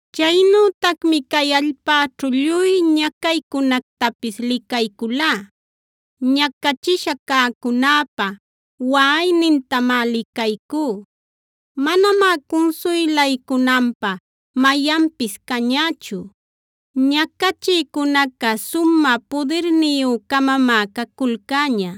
Chaynütacmi cay allpäćhu lluy ñacaycunactapis licayculá. Ñacachisha cäcunäpa waꞌaynintamá licaycú; manamá cunsuylaycunanpä mayanpis cañächu. Ñacachïcunaca sumä pudirniyü-camamá caculcäña;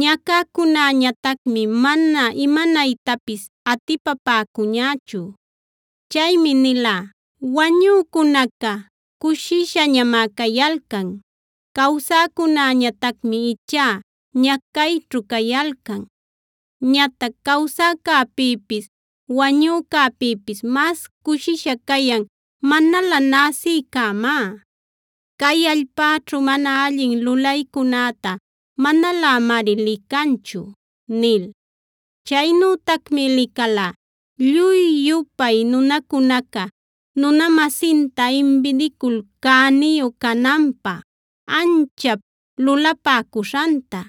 ñacäcunäñatacmi mana imanaytapis atipapäcuñächu. Chaymi nilá: “Wañücunaca cushishañamá cayalcan; cawsäcunäñatacmi ichá ñacayćhu cayalcan. Ñatac cawsäcäpïpis wañücäpïpis mas cushisha cayan manalä näsïcämá; cay allpäćhu mana allin lulaycunäta manalämari licanchu” nil. Chaynütacmi licalá lluy-yupay nunacunaca nuna-masinta imbidicul cäniyu cananpä anchap lulapäcuśhanta.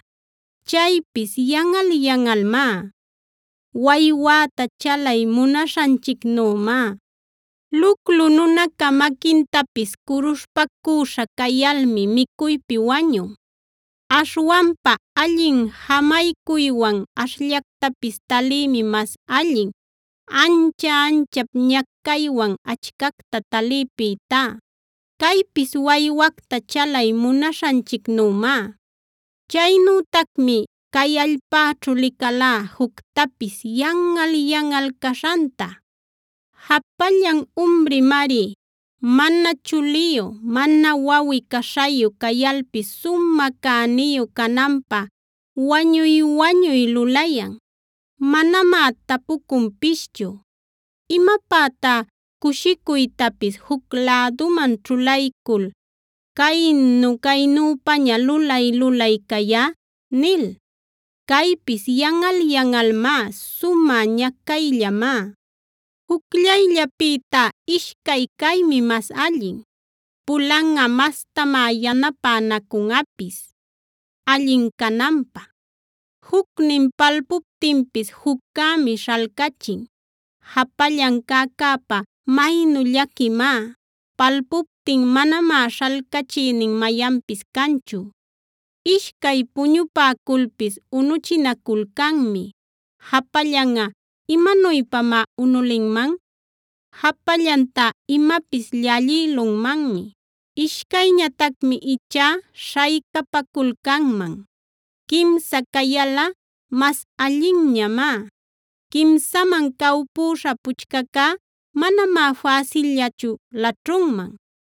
Chaypis yanꞌal-yanꞌalmá; waywäta chalay munaśhanchicnümá. Luclu nunaca maquintapis curuśhpacüśha cayalmi micuypi wañun. Aśhwanpa allin jamaycuywan ashllactapis taliymi mas allin, ancha-anchap ñacaywan achcacta taliypïtá. Caypis waywacta chalay munaśhanchicnümá. Chaynütacmi cay allpäćhu licalá juctapis yanꞌal-yanꞌal caśhanta. Japallan umrimari, mana chuliyu, mana wawꞌi-caśhayu cayalpis sumä cäniyu cananpä wañuy-wañuy lulayan. Manamá tapucunpischu: “¿Imapätá cushicuytapis juc läduman ćhulaycul caynu-caynüpaña lulay-lulay cayá?” nil. Caypis yanꞌal-yanꞌalmá; sumä ñacayllamá. Jucllayllapïtá ishcay caymi mas allin; pulanꞌa mastamá yanapänacunꞌapis allin cananpä. Jucnin palpuptinpis juccämi śhalcachin. Japallan cäcäpa maynu llaquimá; palpuptin manamá śhalcachïnin mayanpis canchu. Ishcay puñupäculpis unuchinaculcanmi; japallanꞌa ¿imanuypamá unulinman? Japallantá imapis llallïlunmanmi; ishcayñatacmi ichá śhaycapaculcanman. Quimsa cayalꞌa mas allinñamá; quimsaman cawpüśha puchcacá manamá fäsillachu laćhunman.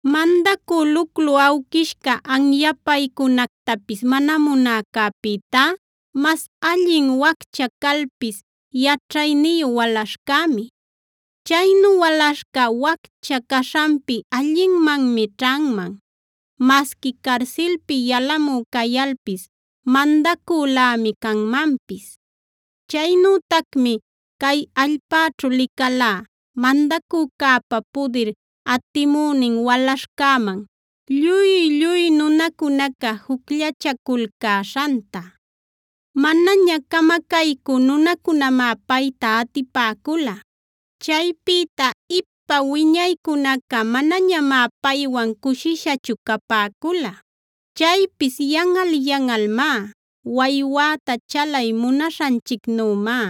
Mandacü luclu awquishca anyapaycunactapis mana munäcäpïtá, mas allin waccha calpis yaćhayniyu walaśhcämi. Chaynu walaśhca, waccha caśhanpi allinmanmi ćhanman; masqui carsilpi yalamü cayalpis mandacülämi canmanpis. Chaynütacmi cay allpäćhu licalá, mandacücäpa pudir atimünin walaśhcäman lluy-lluy nunacunaca jucllachaculcäśhanta. Manaña camacaycü nunacunamá payta atipäcula; chaypïta ipa wiñaycunaca manañamá paywan cushishachu capäcula. Chaypis yanꞌal-yanꞌalmá; waywäta chalay munaśhanchicnümá.